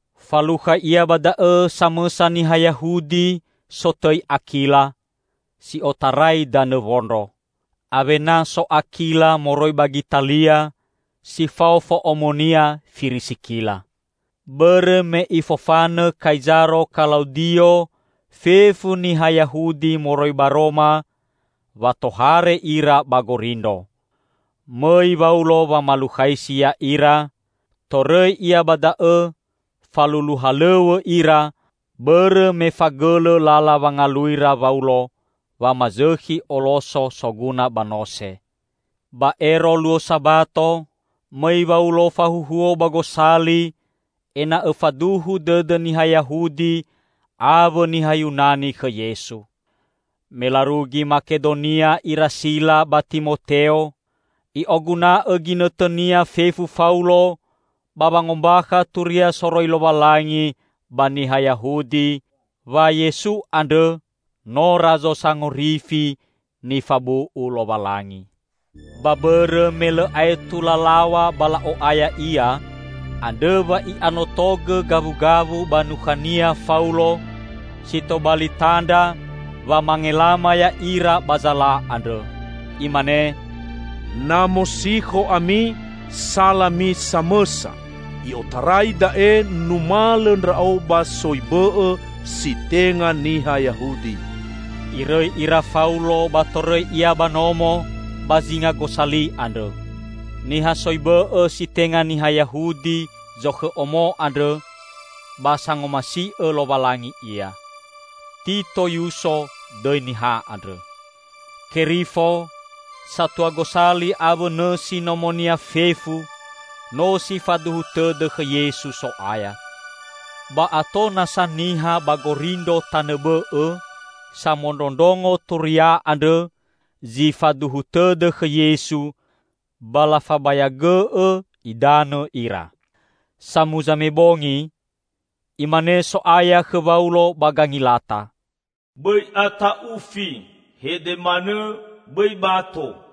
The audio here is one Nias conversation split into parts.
Falukha ia ba da'õ samõsa niha Yahudi sotõi Akila, si otarai danõ Wondro. Awena so Akila moroi ba Gitalia, si fao fo'omonia Firisikila. Bõrõ me ifofanõ Kaizaro Kalaudio fefu niha Yahudi moroi ba Roma, wa tohare ira ba Gorindro. Mõi Waulo wamalukhaisi ya'ira, torõi ia ba da'õ, falulu halõw̃õ ira, bõrõ me fagõlõ lala wangaluira Waulo, wamazõkhi oloso soguna ba nose. Ba ero luo Sabato, mõi Waulo fahuhuo ba gosali ena'õ faduhu dõdõ niha Yahudi awõ niha Yunani khõ Yesu. Me larugi Makedonia ira Sila ba Timoteo, i'oguna'õ ginõtõnia fefu Faulo ba wangombakha Turia soroi Lowalangi ba niha Yahudi, wa Yesu andrõ no Razo Sangorifi nifabu'u Lowalangi. Ba bõrõ me lõ aetu lalaw̃a ba la'o'aya ia, andrõ wa'i'anotogõ gawugawu ba nukhania Faulo si tobali tandra wamangelama ya'ira ba zala andrõ. Imane, "Na mosikho ami, salami samõsa! I'otarai da'e numalõ ndra'o ba soi bõ'õ si tenga niha Yahudi." Irõi ira Faulo ba torõi ia ba nomo ba zinga gosali andrõ. Niha soi bõ'õ si tenga niha Yahudi zokhõ omo andrõ, ba sangomasi'õ Lowalangi ia. Tito Yuso dõi niha andrõ. Kerifo, satua gosali awõ nõsi nomonia fefu no si faduhu tõdõ khõ Yesu So'aya. Ba ato nasa niha ba Gorindro tanõ bõ'õ samondrondrongo turia andrõ zi faduhu tõdõ khõ Yesu ba lafabayagõ'õ idanõ ira. Samuza me bongi, Imane So'aya khõ Waulo ba gangilata, "Bõi ata'ufi! Hede manõ, bõi bato.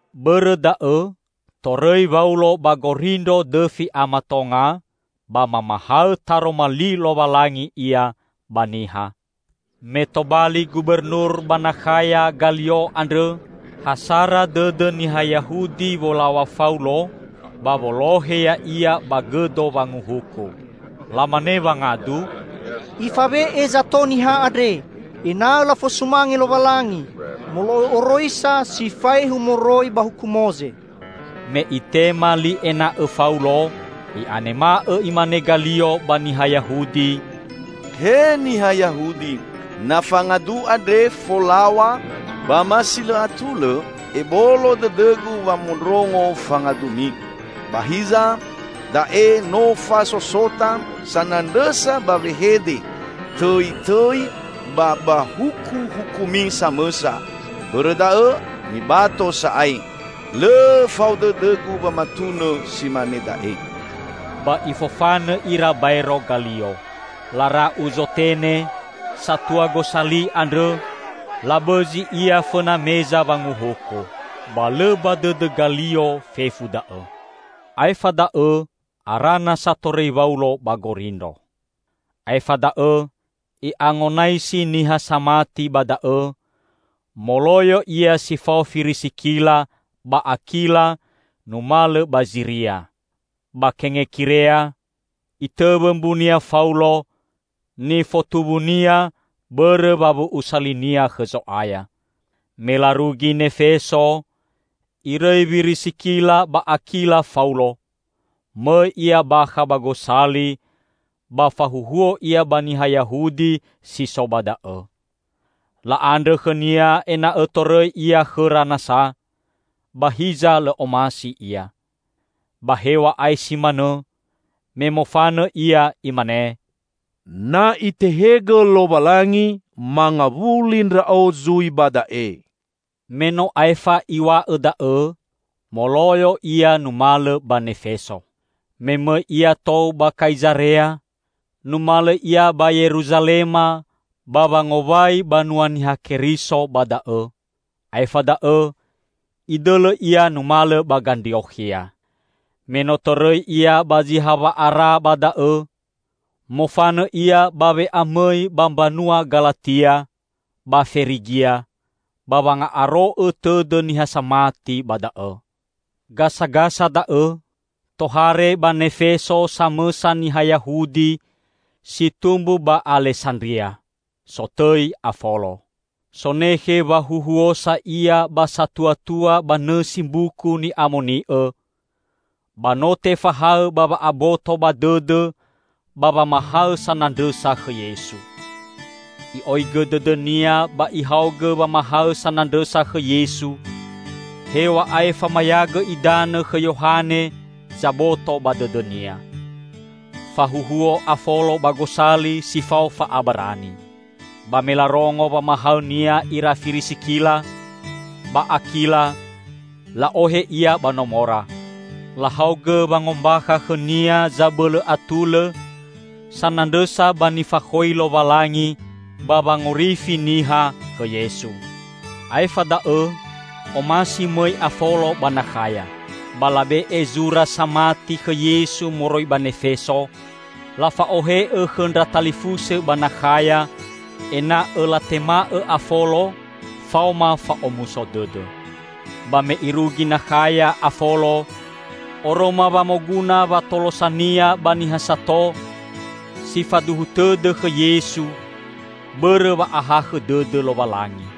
Bõrõ da'õ torõi Waulo ba Gorindro dõfi a matonga, ba mamahaõ taroma li Lowalangi ia ba niha. Me tobali gubernur ba Nakhaya Galio andrõ, ha sara dõdõ niha Yahudi wolaw̃a Faulo ba wolohe ya'ia ba gõdo wanguhuku. Lamane wangadu, "Ifawe'e zato niha andre ena'õ lafosumange Lowalangi, molo'õ oroisa si faehu moroi ba huku Moze!" Me itema li ena'õ Faulo, i'anema'õ imane Galio ba niha Yahudi, "He niha Yahudi! Na fangadu andre folaw̃a ba ma si lõ atulõ, ebolo dõdõgu wamondrongo fangadumi. Ba hiza, da'e no fasosota sanandrõsa ba wehede, tõitõi ba ba hukuhukumi samõsa! Bõrõ da'õ mibato sa'ae. Lõ fao dõdõgu wamatunõ si mane da'e!" Ba ifofanõ ira baero Galio. Lara'u Zotene, satua gosali andrõ, labõzi ia fõna meza wanguhuku. Ba lõ ba dõdõ Galio fefu da'õ. Aefa da'õ ara nasa torõi Waulo ba Gorindro. Aefa da'õ i'angonaisi niha samati ba da'õ, moloyo ia si fao Firisikila ba Akila numalõ ba Ziria. Ba Kengekirea, itõwõ mbunia Faulo, nifotuwunia bõrõ wawu'usa linia khõ Zo'aya. Me larugi Nefeso, irõi Wirisikila ba Akila Faulo, mõi ia bakha ba gosali ba fahuhuo ia ba niha Yahudi si so ba da'õ. La'andrõ khõnia ena'õ torõi ia khõra nasa, ba hiza lõ omasi ia. Ba hew̃a'ae si manõ, me mofanõ ia, imane, "Na Itehegõ Lowalangi, mangawuli ndra'o zui ba da'e." Me no aefa iw̃a'õ da'õ, moloyo ia numalõ ba Nefeso. Me mõi ia tou ba Kaizarea, numalõ ia ba Yeruzalema ba wangowai banua Niha Keriso ba da'õ, aefa da'õ idõlõ ia numalõ ba Gandriokhia. Me no torõi ia ba zi hawa'ara ba da'õ, mofanõ ia ba we'amõi ba mbanua Galatia ba Ferigia ba wanga'aro'õ tõdõ niha samati ba da'õ. Gasagasa da'õ, tohare ba Nefeso samõsa niha Yahudi si tumbu ba Alesandria, sotõi Afolo. Sonekhe wahuhuosa ia ba satuatua ba nõsi Mbuku Ni'amoni'õ, ba no tefahaõ ba wa'aboto ba dõdõ ba wamahaõ sanandrõsa khõ Yesu. I'oigõ dõdõnia ba ihaogõ wamahaõ sanandrõsa khõ Yesu, hew̃a'ae famayagõ idanõ khõ Yohane zaboto ba dõdõnia. Fahuhuo Afolo ba gosali si fao fa'abarani. Ba me larongo wamahaõnia ira Firisikila ba Akila, la'ohe ia ba nomora. Lahaogõ wangombakha khõnia zabõlõ atulõ sanandrõsa ba nifakhoi Lowalangi ba wangorifi niha khõ Yesu. Aefa da'õ omasi mõi Afolo ba Nakhaya. Ba labe'e zura samati khõ Yesu moroi ba Nefeso, lafa'ohe'õ khõ ndra talifusõ ba Nakhaya ena'õ latema'õ Afolo faoma fa'omuso dõdõ. Ba me irugi Nakhaya Afolo, oroma wa moguna watolosania ba niha sato si faduhu tõdõ khõ Yesu bõrõ wa'ahakhõ dõdõ Lowalangi.